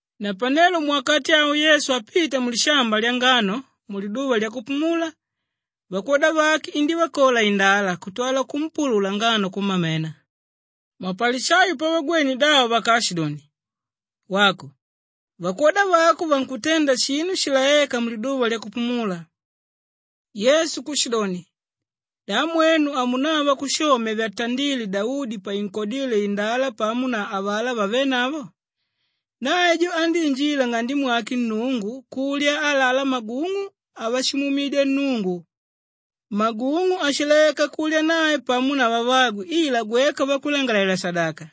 Napanelo muwakati awo Yesu apita mulishamba lyangano muliduva lyakupumula, vakwoda vake indívakola indala kutwala kumpulula ngano kumamena. Mapalishayo pavagwene davo vakaashidoni, “Wako, vakwoda vako vankutenda shinu shilaéka muliduva lyakupumula.” Yesu kushidoni, “Da mwenu hamunava kushomya vyatandíle Daudi painkodíle indala pamo na avalá vavenavo? Nae jo andíinjila nng'ande mwake Nnungu kulya alalá magung'u avashimuumidya Nnungu, magung'u áshilaeka kulya nae pamo na vavagwe ila gweka vakulangalalela-shadaka.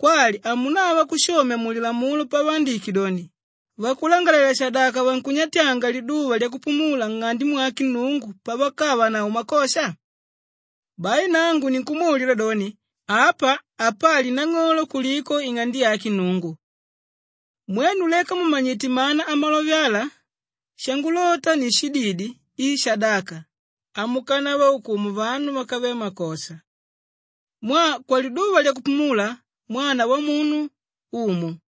Kwali hamunava kushomya mu Lilamulo pavaandike doni, vakulangalalela-shadaka vankunyatyanga liduva lyakupumula nng'ande mwake Nnungu pavakavanavo makosha? Bai nangu ninkumwalila doni, apa apali nang'olo kuliko ing'ande yake Nnungu. Mwenu leka mumanyite mana amalove ala, ‘Shangulota ni shididi i shadaka,’ hamukanavaukumu vanu vákave makosha. Mwaa kwaliduva lyakupumula, Mwana Wamunu, Umu.”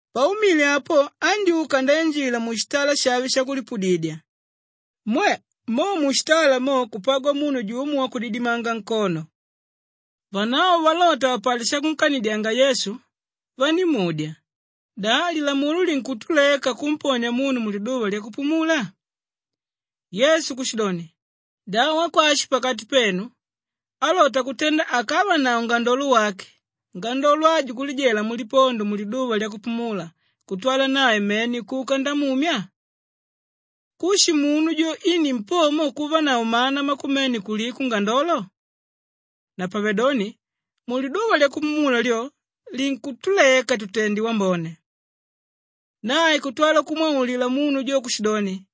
Paumile apo andyúka ndainjila mushitala shave shakulipudidya. Mwe! Mo mushitala mo kupagwa munu jumo wakudidimanga nkono. Vanavo valota vapate shakunkanidyanga Yesu, vandímudya, “Da lilamulo linkutuleka kumponia munu muliduva lyakupumula?” Yesu kushidoni, “Da wakwashi pakati penu álota kutenda akavanavo ngandolo wake, ngandolo ajo kulijela mulipondo muliduva lyakupumula kutwala nae mene kuka ndamumya? Kushi munu jo i nimpomo kuvanavo mana makumene kuliko ngandolo. Napavedoni muliduva lyakupumula lyo, linkutuleka tutende wambone.” Nae kutwala kumwaulila munu jo kushidoni,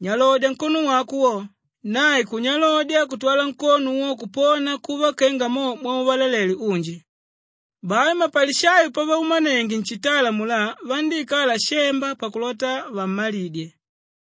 “Nyalodya nkono wako wo!” Nae kunyalodya kutwala nkono wo kupona kuva kenga mo mwauvalalele unji. Bai mapalishayo pavaumanenge nshitala amulá, vandíikala shemba pakulota vammalidye.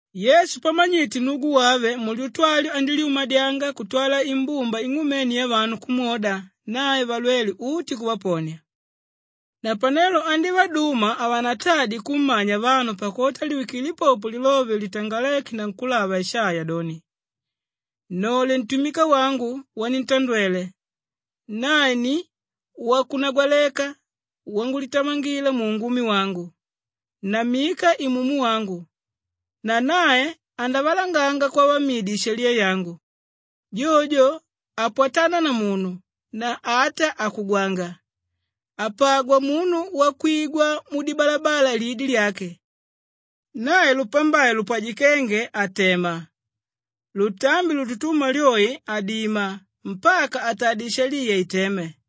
Yesu pamanyite nnugu wave, mulyutu alyo andílyumadyanga kutwala imbumba ing'umene yavanu kumwoda, nae valwele uti kuvaponia. Napanelo andívaduma havanatadye kummanya vanu pakulota liwikile popo lilove litangaléke na nkúlava Ishaiya doni, “Nnole ntumika wangu wanintandwele, nae ni wakunagwaleka wangulitamangila muungumi wangu. Nammika Imumu wangu, na nae andavalanganga kwavamidi ishaliya yangu. Jojo jo hapwatana na munu na ata hakugwanga, hapagwa munu wakwigwa mudibalabala lidi lyake. Nae lupambai lupwajikénge hatema, lutambi lututuma lyoi hadima, mpaka atadye ishaliya iteme.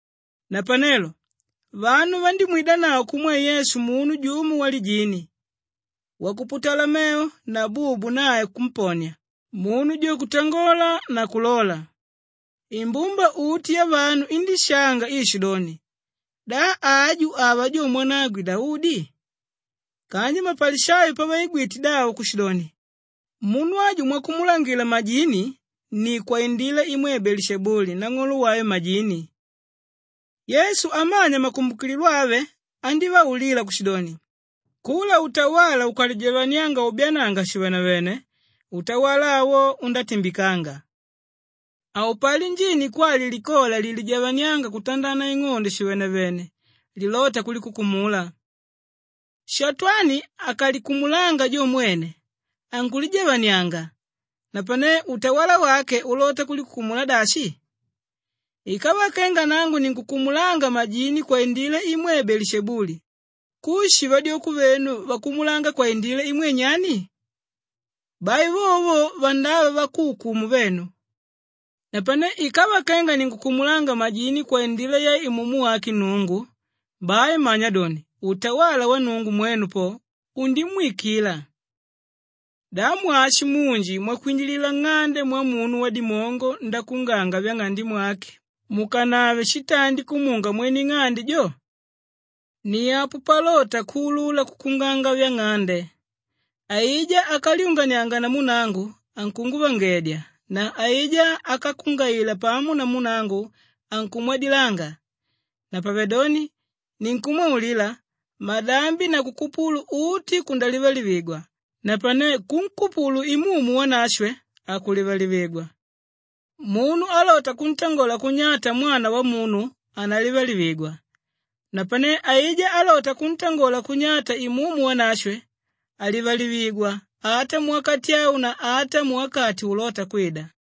Napanelo vanu vandímwidanavo kumwe Yesu munu jumo walijini, wakuputala mevo na bubu nae kumponia, munu jo kutangola na kulola. Imbumba uti yavanu indishanga iishidoni, “Da aju, ava jo mwanagwe Daudi?” Kanji mapalishayo pavaigwite davo kushidoni, “Munu aju mwakumulangila majini ni kwaindila imwe Beelishebuli nang'olo wave majini.” Yesu amanya makumbukililo avo andívaulila kushidoni, “Kula utawala ukalijavanianga ubyaananga shivenevene, utawala awo undatimbikanga. Haupali njini kwali likola lilijavaniánga kutandana ing'ondo shivenevene lilóta kulikukumula. Shatwani akalikumulanga jo mwene, ankulijavanianga, napane utawala wake ulota kulikukumula dashi? Ikava kenga nangu ninkukumulanga majini kwaindila imwe Beelishebuli, kushi vadyoko venu vakumulanga kwaindila imwe nyani? Bai vovo vandava vakuukumu venu. Napane ikava kenga ninkukumulanga majini kwaindila ya Imumu wake Nnungu, bai manya doni utawala wa Nnungu mwenu po, undimwikila. “Da mwashi munji mwakwinjilila nng'ande mwamunu wadimongo ndakuunganga vyang'ande mwake mukanave shitandi kumunga mwene ing'ande jo? Ni apo palota kuulula kukuunganga vyang'ande. Aijá ákalyunganianga namu nangu, ankunguvangedya na aijá ákakungaila pamo namu nangu, ankumwadilanga. Napavedoni ninkumwaulila, madambi na kukupulu uti kundalivalivigwa napane kunkupulu Imumu Wanashwe hakulivalivigwa. Munu álota kuntangola kunyata Mwana Wamunu, analivalivigwa napane áija álota kuntangola kunyata Imumu Wanashwe, halivalivigwa ata muwakati au na ata muwakati ulóta kwida.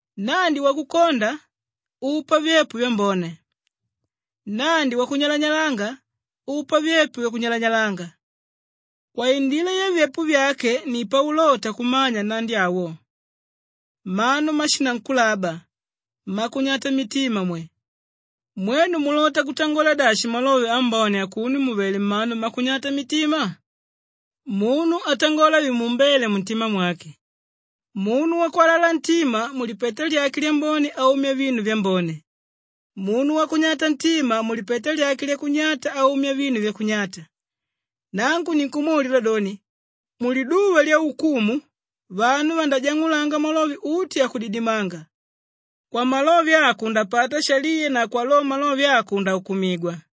“Nnandi wakukonda upa vyepo vyambone, nnandi wakunyalanyalanga upa vyepo vyakunyalanyalanga. Kwaindila yavyepo vyake ni paulota kumanya nnandi awo. Mmanu mmashinankulaba mmakunyata mitima mwe! Mwenu mulota kutangola dashi malove ambone akuno mùvele mmanu mmakunyata mitima? Munu atangola vimuumbéle muntima mwake. Munu wakwalala ntima, mulipeta lyake lyambone aumya vinu vyambone. Munu wakunyata ntima, mulipeta lyake lyakunyata aumya vinu vyakunyata. Nangu ninkumwaulila doni, muliduva lyaukumu vanu vandajang'ulanga malove uti akudidimanga. Kwamalove ako undapata shaliya na kwa lo malove ako undaukumigwa.”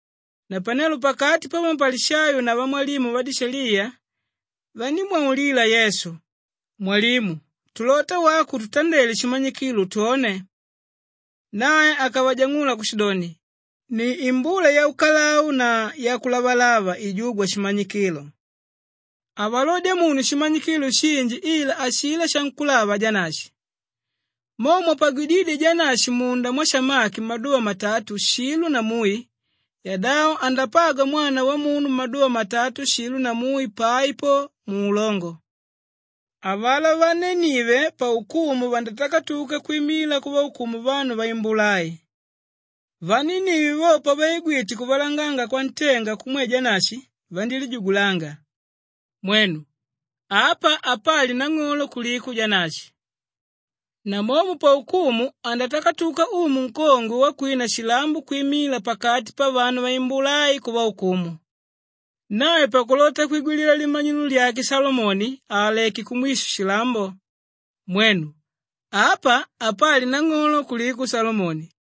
Napanelo pakati pamapalishayo na vamwalimu vadishaliya vandímwaulila Yesu, “Mwalimu, tulota wako ututandele shimanyikilo twone.” Nae akavajang'ula kushidoni, “Ni imbula yaukalau na yakulavalava ijúgwa shimanyikilo. Havalodya munu shimanyikilo shinji ila ashilá shankúlava Janashi. Mo mwapagwidídye Janashi munda mwasamaki maduva matatu shilo na mui, yadavo andapagwa Mwana Wamunu maduva matatu shilo na mui pai po muulongo. Avalá vanenive paukumu vandatakatuka kwimila kuvaukumu vanu vaimbula ai. Vanenive vo, pavaigwite kuvalanganga kwantenga kumwe Janashi vandílijugulanga. Mwenu! Apa apali nang'olo kuliko Janashi. Namomo paukumu andatakatuka umu nkongwe wakwina shilambo kwimila pakati pavanu vaimbula ai kuvaukumu. Nae pakulota kwigwilila limanyilo lyake Shalomoni, aaleké kumwisho shilambo. Mwenu! Apa apali nang'olo kuliko Shalomoni.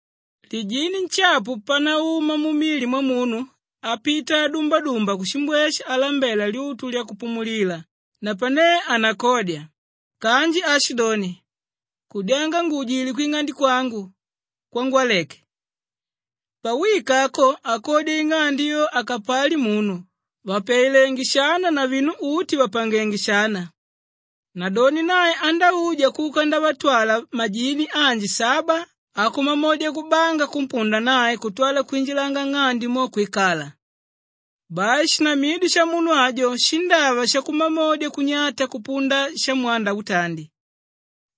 “Lijini nshapu panauma mumili mwamunu apita adumbadumba kushimbweshe alambela lyutu lyakupumulilila napane hanakodya, kanji aashidoni, ‘Kudyanga nguujile kwing'ande kwangu kwangwaleke.’ Pawika ako akodya ing'ande yo akapali munu, vàpyailenge shana na vinu uti vàpangenge shana. Nadoni nae andauja kuka ndavatwala majini anji saba akumamodya kubanga kumpunda nae kutwala kwinjilanga nng'ande mo kwikala. Bai shinamidyo shamunu ajo shindava shakumamodya kunyata kupunda shamwanda utandi.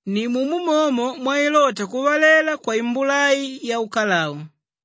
Nimumo momo mwailota kuvalela kwaimbula ai yaukalau.”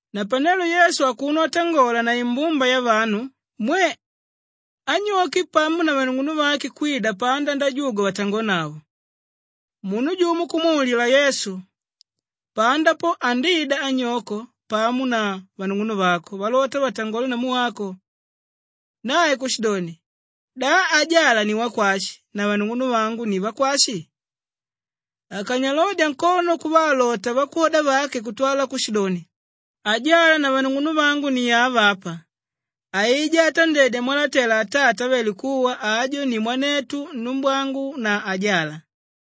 Napanelo Yesu akuno atangola na imbumba yavanu, mwe! Anyoke pamo na vanung'unuvake kwida panda ndajugwa vatangonavo. Munu jumo kumwaulila Yesu, “Panda po, andida anyoko pamo na vanung'unuvako valota vatangole namu wako.” Nae kushidoni, “Da ajala ni wakwashi na vanung'unuvangu ni vakwashi?” Akanyalodya nkono kuvaalota vakwoda vake kutwala kushidoni, “Ajala na vanung'unuvangu ni ava apa. Aijá átandedya mwalatela Atata ávele kuwa, ajo ni mwanetu, numbwangu na ajala.”